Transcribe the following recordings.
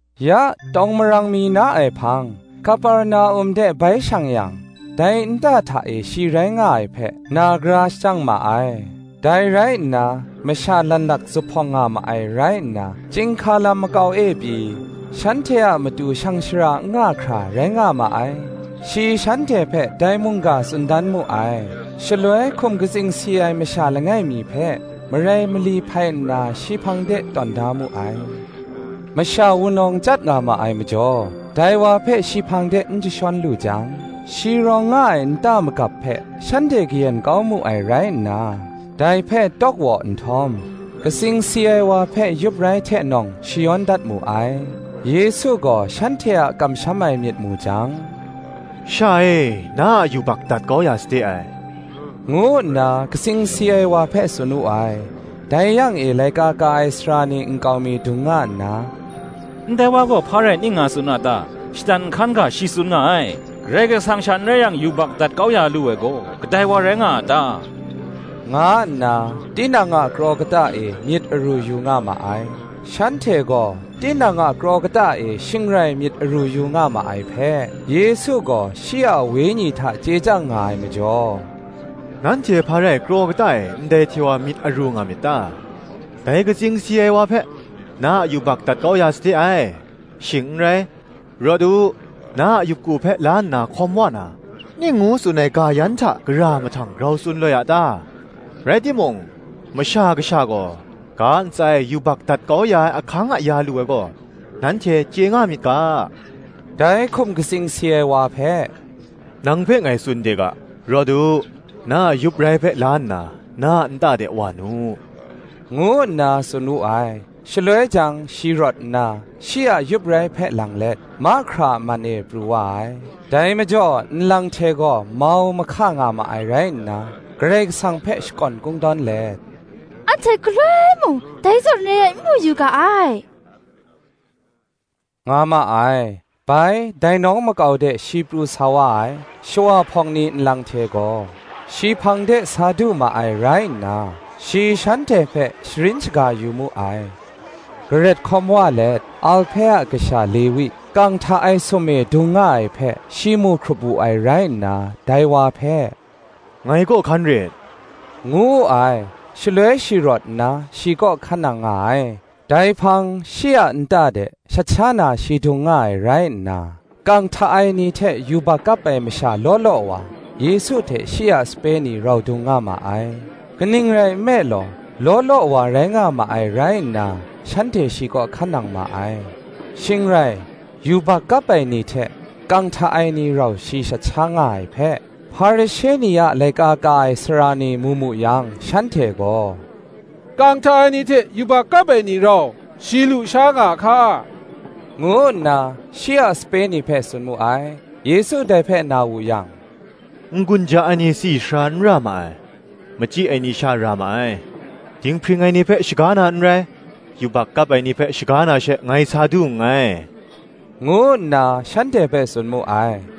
Ya tawng marang mi na ai hpang Kaperna-um de bai shang yang, dai nta hta e shi rai nga ai hpe, na gara shajang ma ai. Dai rai nna, masha lanlak zuphpawng nga ma ai rai nna, chyinghka lam makau e pyi, shanhte a matu shang shara n nga hkra, rai nga ma ai: shi shanhte hpe dai mungga tsun dan mu ai. Shaloi hkum katsing si ai masha langai mi hpe, marai mali hpai nna shi hpang de tawn da mu ai. Masha wunawng chyat nga ma ai majaw, dai wa hpe shi hpang de n jashawn lu jang shi rawng nga ai nta magap hpe shanhte kayen kau mu ai rai nna, dai hpe tawk waw nhtawm, katsing si ai wa hpe yup rai hte nawng shayawn dat mu ai. Yesu gaw shanhte a kamsham ai myit mu jang, Sha e, na a yubak dat kau ya sade ai, ngu nna katsing si ai wa hpe tsun wu ai. Dai yang e laika ka ai sara ni nkau mi dung nga nna, Ndai wa gaw, hpa rai ning nga tsun a ta? shatan nhkan ga shi tsun nga ai: Karai Kasang sha n rai yang yubak dat kau ya lu ai gaw kadai wa rai nga a ta? nga nna tinang a kraw kata e myit aru yu nga ma ai. Shanhte gaw tinang a kraw kata e shing rai myit aru yu nga ma ai hpe, Yesu gaw shi a wenyi hta chye chyang nga ai majaw, “Nanhte hpa rai kraw kata e ndai hte wa myit aru nga myit ta? Dai katsing si ai wa hpe, ‘Na a yubak dat kau ya sade ai;’ shing n rai, ‘Rawt u, na a yup ku hpe la nna hkawn wa nu,’ ning ngu tsun ai ga yan hta gara mahtang grau tsun loi a ta? Rai timung, Masha Kasha gaw, ga ntsa e, yubak dat kau ya ai ahkang aya lu ai gaw, nanhte chye nga myit ga,” dai hkum katsing si ai wa hpe, “Nang hpe ngai tsun de ga, ‘Rawt u, na a yup rai hpe la nna, na a nta de wa nu,” ngu nna tsun wu ai. Shaloi jang shi rawt nna, shi a yup rai hpe lang let, mahkra a man e pru wa ai; dai majaw nlang hte gaw mau mahka nga ma ai rai nna, Karai Kasang hpe shakawn kungkawn let, “Anhte galoi mung, dai zawn re ai n mu yu ga ai,” nga ma ai. Bai, dai nawng makau de shi pru sa wa ai; shawa hpawng ni nlang hte gaw, shi hpang de sa du ma ai rai nna, shi shanhte hpe sharin shaga ya mu ai. Garet hkawm wa let, Alhpe a kasha Lewi, kang hta ai sum e dung nga ai hpe, shi mu hkrup wu ai rai nna, dai wa hpe, “Ngai kaw hkan rit,” ngu wu ai. Shaloi shi rawt nna, shi kaw hkan nang nga ai. Dai hpang shi a nta de shat sha na shi dung nga ai rai nna, kang hta ai ni hte yubak kap ai masha law law wa, Yesu hte shi a sape ni rau dung nga ma ai: kaning rai nme law, law law wa rai nga ma ai rai nna shanhte shi kaw hkan nang ma ai. Shing rai, yubak kap ai ni hte, kang hta ai ni rau shi shat sha nga ai hpe, Hparishe ni a laika ka ai sara ni mu mu yang shanhte gaw, “Kang hta ai ni hte yubak kap ai ni rau, shi lusha nga a hka?” ngu nna, shi a sape ni hpe tsun mu ai. Yesu dai hpe na wu yang, “N-gun ja ai ni tsi sara n ra ma ai, machyi ai ni sha ra ma ai; dinghpring ai ni hpe shaga na n rai, yubak kap ai ni hpe shaga na she ngai sa du nngai,” ngu nna shanhte hpe tsun mu ai.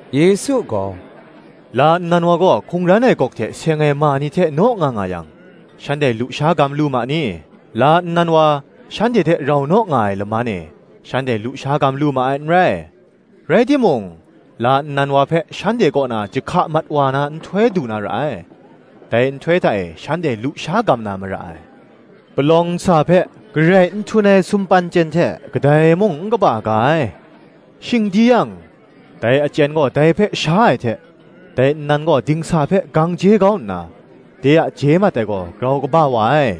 Yesu gaw, “La nnan wa gaw hkungran ai gawk hte seng ai ma ni hte naw nga nga yang, shanhte lusha gam lu ma ni? la nnan wa, shanhte hte rau naw nga ai laman e, shanhte lusha gam lu ma ai n rai. Rai timung la nnan wa hpe shanhte kaw na jahka mat wa na nhtoi du na ra ai; dai nhtoi hta e shanhte lusha gam na mara ai. Palawng nsa hpe, garai n htun ai sumpan chyen hte kadai mung n kapa ga ai: shing di yang, dai achyen gaw dai hpe sha ai hte, dai nnan gaw dingsa hpe gang je kau nna, de a je mat ai gaw grau kaba wa ai.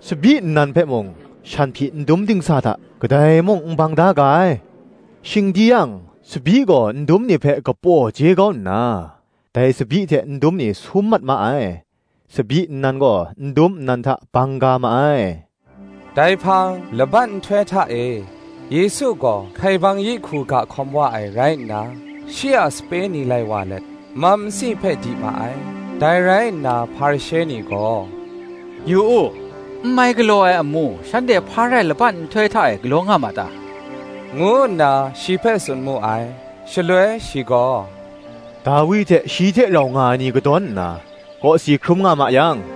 Tsabyi nnan hpe mung, shanhpyi ndum dingsa hta, kadai mung n bang da ga ai: shing di yang, tsabyi gaw ndum ni hpe kapaw je kau nna, dai tsabyi hte ndum ni sum mat ma ai. (Tsabyi nnan gaw, ndum nnan hta bang ga ma ai.)” Dai hpang laban nhtoi hta e, Yesu gaw hkaibang yi hku ga hkawm wa ai rai nna, shi a sape ni lai wa let, mam nsi hpe di ma ai. Dai rai nna Hparishe ni gaw, “Yu u, n mai galaw ai amu, shanhte hpa rai laban nhtoi hta e galaw nga ma ta?” ngu nna shi hpe tsun mu ai. Shaloi shi gaw, “Dawi hte shi hte rau nga ai ni kadawn nna, kawsi hkrum nga ma yang,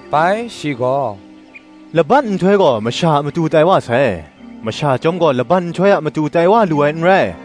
Bai shi gaw, “Laban nhtoi gaw masha a matu tai wa sai, masha chyawm gaw laban nhtoi a matu tai wa lu ai n rai: